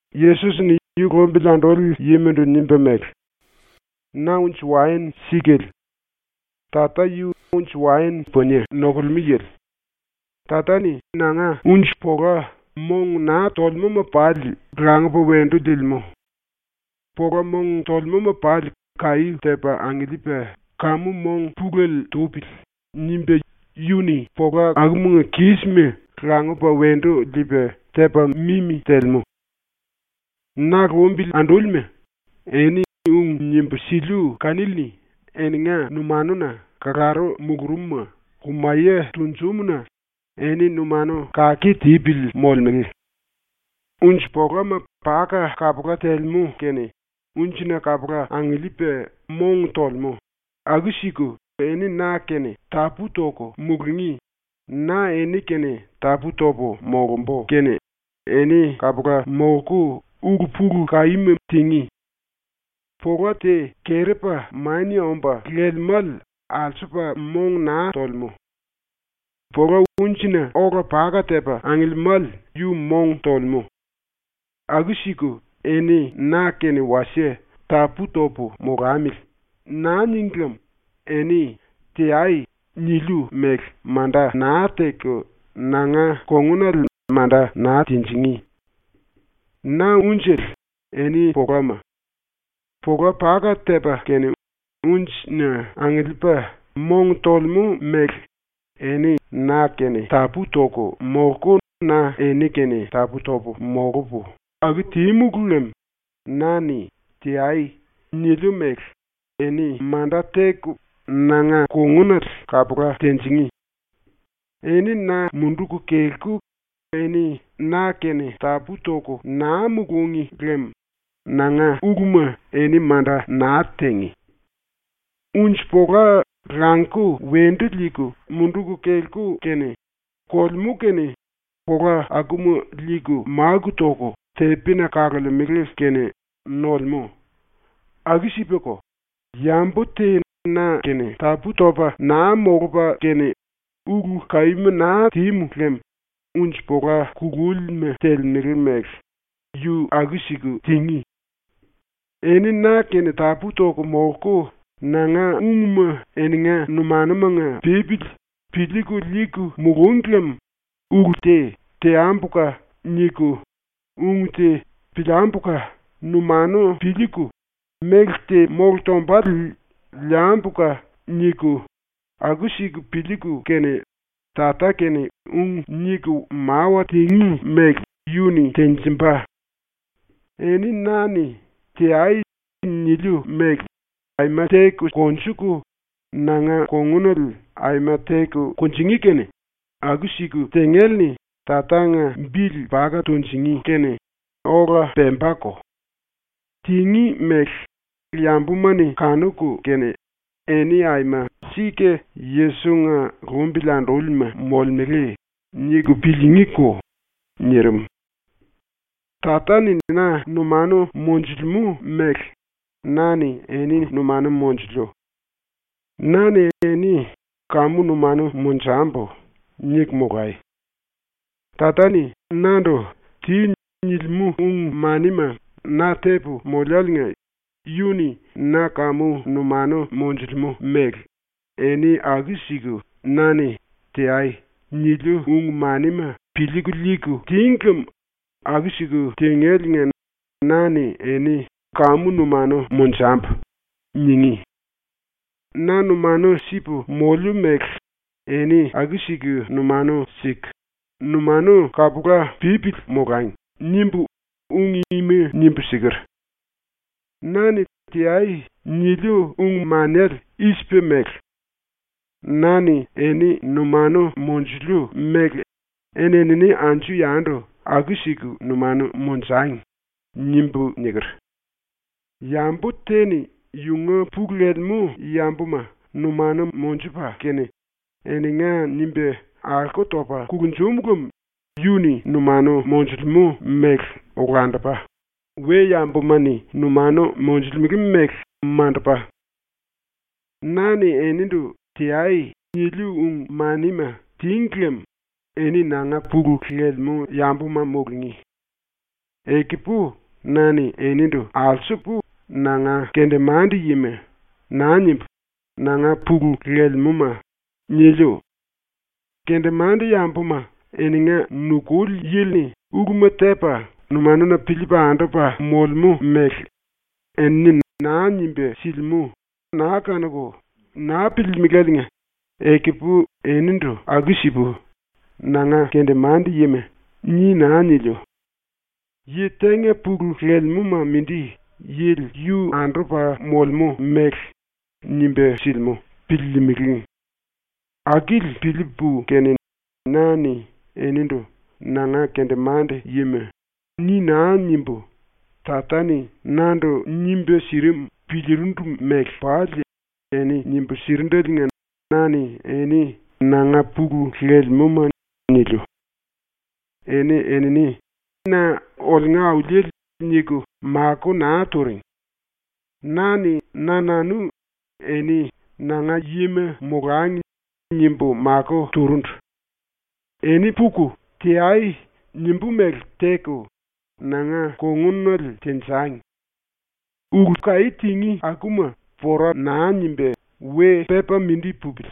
⸤Yesos-ni yu lumbili anduli yimandu nimba mele:⸥ “Na unji-waen sikale. Tata yu unji-waen punie nokulemú yili. Tata-ni nanga unji-pola mong naa tolemúma pali langupa wendu liilimú. Pola mong tolemúma pali ‘Kaí tepa angiliipa kamu mong pulele tupili.’ nimba yu-ni pola akumanga kísima langupa wendu liipa tepa mimi telemú. “Na lumbili andúlima, eni ung nimbu siliu kanili-ni ⸤eninga numanuna kalaru mulurumuma lumaye tunjumu-na⸥ eni ⸤numanu⸥ kake tipili molemele. Unji-polama paka kapula telemú kene unjina kapula angiliipa mong tolemú, aku-siku eni na-kene tapú-toku mulungí, na eni-kene tapú-topu molumbu kene eni kapula molku ulu-pulu-kaíma tingí. Pola te kerepa mania omba lelemále alsupa mong naa tolemú. Pola unjina ola paka tepa angiliimále yu mong tolemú. Aku-siku eni na-kene wasie ‘Tapú-topu molamili.’ naa níngi lem eni “Teai.” niliu mele manda naa teku nanga kongunale manda naa tinjingí. “Na unjele, eni polama. Pola paka tepa kene unjina angiliipa mong tolemú mele eni na-kene tapú-toku molku na eni-kene tapú-topu molupu aku tímulu lem na-ni “Teai.” niliu mele eni manda teku nanga kongunale kapula tinjingí. Eni na munduku kelku eni na-kene tapú-toku naa mulúngi lem nanga uluma eni manda naa tingí. Unji-pola languku wendu liiku munduku kelku kene, kolemú kene pola akuma liiku máku toku tepina kalemele kene nolemú. Aku-sipako, yambu te na-kene tapú-topa naa molupa kene ulu-kaíma naa tímu lem unji-pola kulúlima telemele mele yu aku-siku tingí. “Eni na-kene tapú-toku molku nanga ungma eninga numanumanga pípili piliiku liiku mulúngi lem ulu te ‘Teambuka!’ niku, ung te ‘Piliambuka!’ numanu piliiku, méle te mólu tombale ‘Liambuka!’ niku, aku-siku piliiku kene Tata-kene ung niku mawa tingí mele yu-ni tenjimba. Eni na-ni “Teai.” niliu mele aima teku konjuku, nanga kongunale aima teku kunjingí kene aku-siku tingéle-ni Tatanga bili paka tunjingí kene ola pembako. Tingí mele yambuma-ni kanuku kene ‘Eni aima sika Yesos-nga lumbili andúlima molemele.’ niku piliingíko.” ⸤nirim.⸥ “Tata-ni na numanu monjulemú mele na-ni eni numanu monjuliu. Na-ni eni ‘Kamu numanu monjambu.’ niku molai. Tata-ni nandu “Ti.” nilimú ung-manima na tepu moliáliinga yu-ni na kamu numanu monjulemú mele eni aku-siku na-ni “Teai.” niliu ung-manima piliiku liiku tíngi lem aku-siku tingéliinga na-ni eni ‘Kamu numanu monjambu.’ ningí. ‘Na numanu sipu moliu mele eni aku-siku numanu siku numanu kapula pípili molangi.’ nimbu ung ima nimbu siker. “Na-ni “Teai.” niliu ung-manele i-sipa mele: ‘Na-ni eni numanu monjuliu mele eni-enini anju-yandu aku-siku numanu monjangi.’ nimbu niker. Yambu te-ni yunga pulu lelemú yambuma numanu monjupa kene eninga nimba alko topa kulunjum lem yu-ni numanu monjulemú mele olandupa, we-yambuma-ni numanu monjulemele mele mandupa. “Na-ni enindu “Teai.” niliu ung-manima tíngi lem eni nanga pulu lelemú yambuma mulungí. Ekupu na-ni enindu alsupu “Nanga kendemande-yima.” naa nimbu, “Nanga pulu lelemúma.” niliu. Kendemande-yambuma eninga nukuli yili-ni uluma tepa numanuna piliipa andupa molemú mele enini naa nimba silimú naa kanuku naa piliilimiláliinga ekupu enindu aku-sipu “Nanga kendemande-yima.” ni naa niliu. ⸤Yi tenga pulu lelemúma mindi yili yu andupa molemú mele nimba silimú piliilimili. Akili piliipu kene⸥ na-ni enindu “Nanga kendemande-yima.” ni naa nimbu, Tata-ni nandu nimba sirim piliirindu mele pali eni nimbu sirindeliinga na-ni eni “Nanga pulu lelemúma.” niliu. “Eni-enini na ‘Oliunga Auliele.’ niku makó naa turing. Na-ni na-nanu eni ‘Nanga yima molangi.’ nimbu makó turundu. ‘Eni puku, “Teai.” nimbú mele teku, nanga kongunale tenjangi. Ulu-kaí tingí akuma pora naa nimba we pepa mindi pupili.’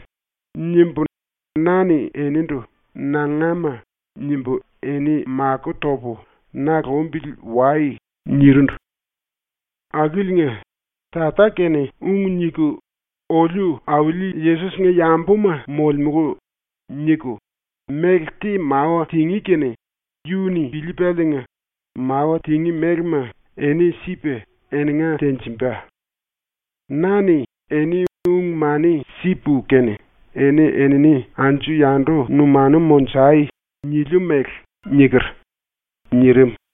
nimbu na-ni enindu “Nangama.” nimbu eni makó topu “Na lumbili wai.” nirindu. Akiliinga, Tata-kene ung niku “Oliu Auli Yesos-nga yambuma molemulu.” niku méle te mawa tingí kene yu-ni piliipaliinga mawa tingí mélema eni sipa eninga tenjimba. Na-ni eni ung-mani sipu kene “Eni-enini anju-yandu numanu monjai!” niliu mele niker.” ⸤nirim.⸥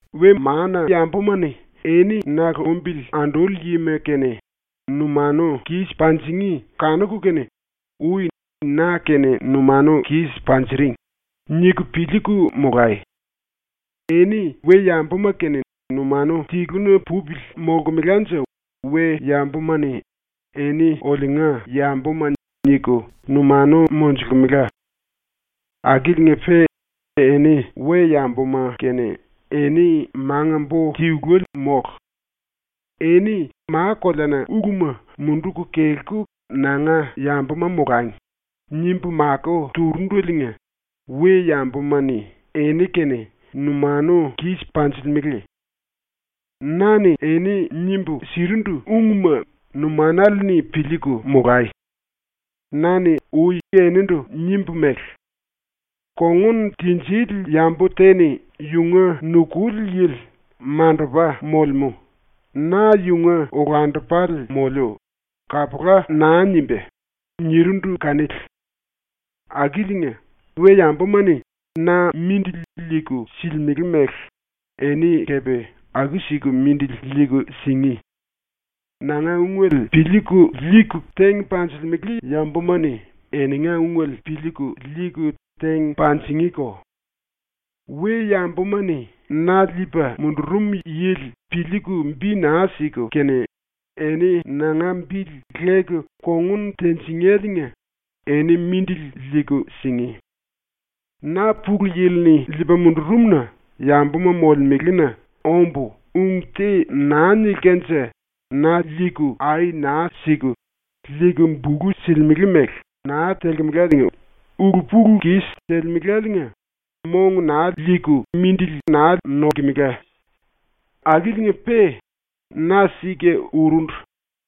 “We-mana-yambuma-ni eni na lumbili anduli yima-kene numanu kis panjingí kanuku kene ‘Ui na-kene numanu kis panjiring.’ niku piliiku molai. Eni we-yambuma-kene numanu tiluna pupili molkemelanje we-yambuma-ni ‘eni oliunga yambuma’ niku numanu monjulkemela. Akiliinga-pe eni we-yambuma-kene eni manga-bo tiluele mólu. ‘Eni ma-koleana uluma munduku kelku nanga yambuma molangi.’ nimbu makó turundeliinga we-yambuma-ni eni-kene numanu kis panjilimele. “Na-ni eni nimbu sirindu ungma numanale-ni piliiku molai. Na-ni ui enindu nimbu mele: “Kongun tinjili yambu te-ni yunga nukuli yili ‘Mandupa molemú. Na yunga olandupale moliu.’ kapula naa nimbá.” nirindu kanili. Akiliinga, we-yambuma-ni na mindili liiku silimele mele eni kepe aku-siku mindili liiku singí. Nanga ungele piliiku liiku teng panjilimele yambuma-ni eninga ungele piliiku liiku teng panjingíko. We-yambuma-ni na liipa mundurum yili piliiku bi naa siku kene, eni nanga bili leku kongun tinjingéliinga eni mindili liiku singí. Na ⸤Pulu Yili-ni liipa mundurum-na⸥ yambuma molemelena ombu ung te naa nilkanje ⸤na liiku ai naa siku, liiku bulu silimele mele naa telkemelaliinga⸥ ulu-pulu-kis telemeláliinga mong naa liilkemela. Akiliinga-pe ⸤na sika urundu,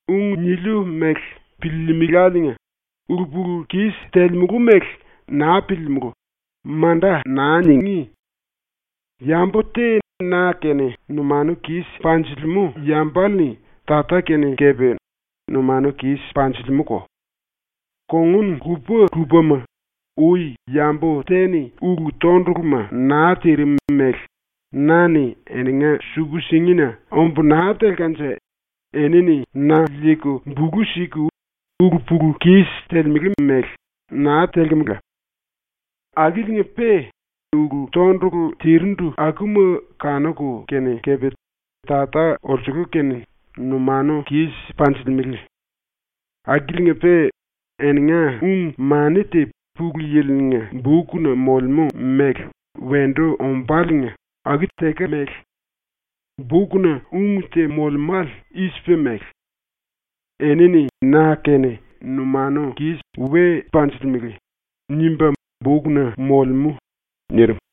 ung niliu mele piliilimiláliinga⸥ “Ulu-pulu-kis telemulu mele naa piliimulú.” manda naa ningí. Yambu te na-kene numanu kis panjilimú yambale-ni Tata-kene kepe numanu kis panjilimúko. Kongun lupa-lupama, ui yambu te-ni ulu-tonduluma naa tirim mele na-ni eninga suku-singina ombu naa telkanje enini na liiku bulu siku ulu-pulu-kis telemele mele naa telkemela. Akiliinga-pe ulu-tondulu tirindu akuma kanuku kene kepe Tata olsulu-kene numanu kis panjilimele. Akiliinga-pe eninga ung-mani te Pulu Yili-nga bukna molemú mele wendu ombáliinga aku tekemele. Bukna ung te molemále i-sipa mele: “Enini na-kene we numanu kis panjilimele.” nimba bukna molemú.” ⸤nirim.⸥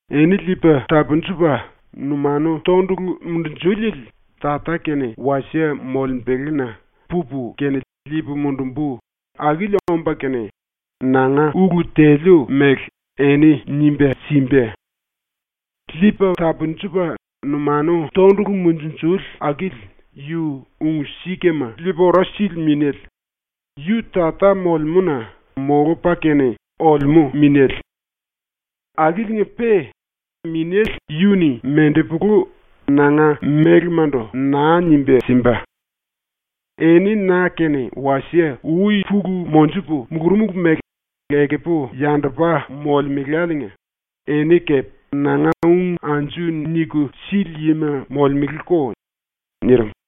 “Eni Liipa Tapunjupa Numanu Tondulu Munjunjuliele Tata-kene wasie molembelena pupu kene liipu mundumbu akili omba kene, nanga ulu teliu mele eni nimba simba. Liipa Tapunjupa Numanu Tondulu Munjunjuli akili yu Ung-Sikama Liipa Ora Sili Minéle, yu Tata molemúna molupa kene olemú Minéle. Akiliinga-pe Minéle yu-ni mendepulu nanga mélemandu naa nimba simba. Eni na-kene wasie ui pulu monjupu mulurumulu mele ekupu yandupa molemuláliinga eni kepe nanga ung anju niku sili yima molemeleko.” ⸤nirim.⸥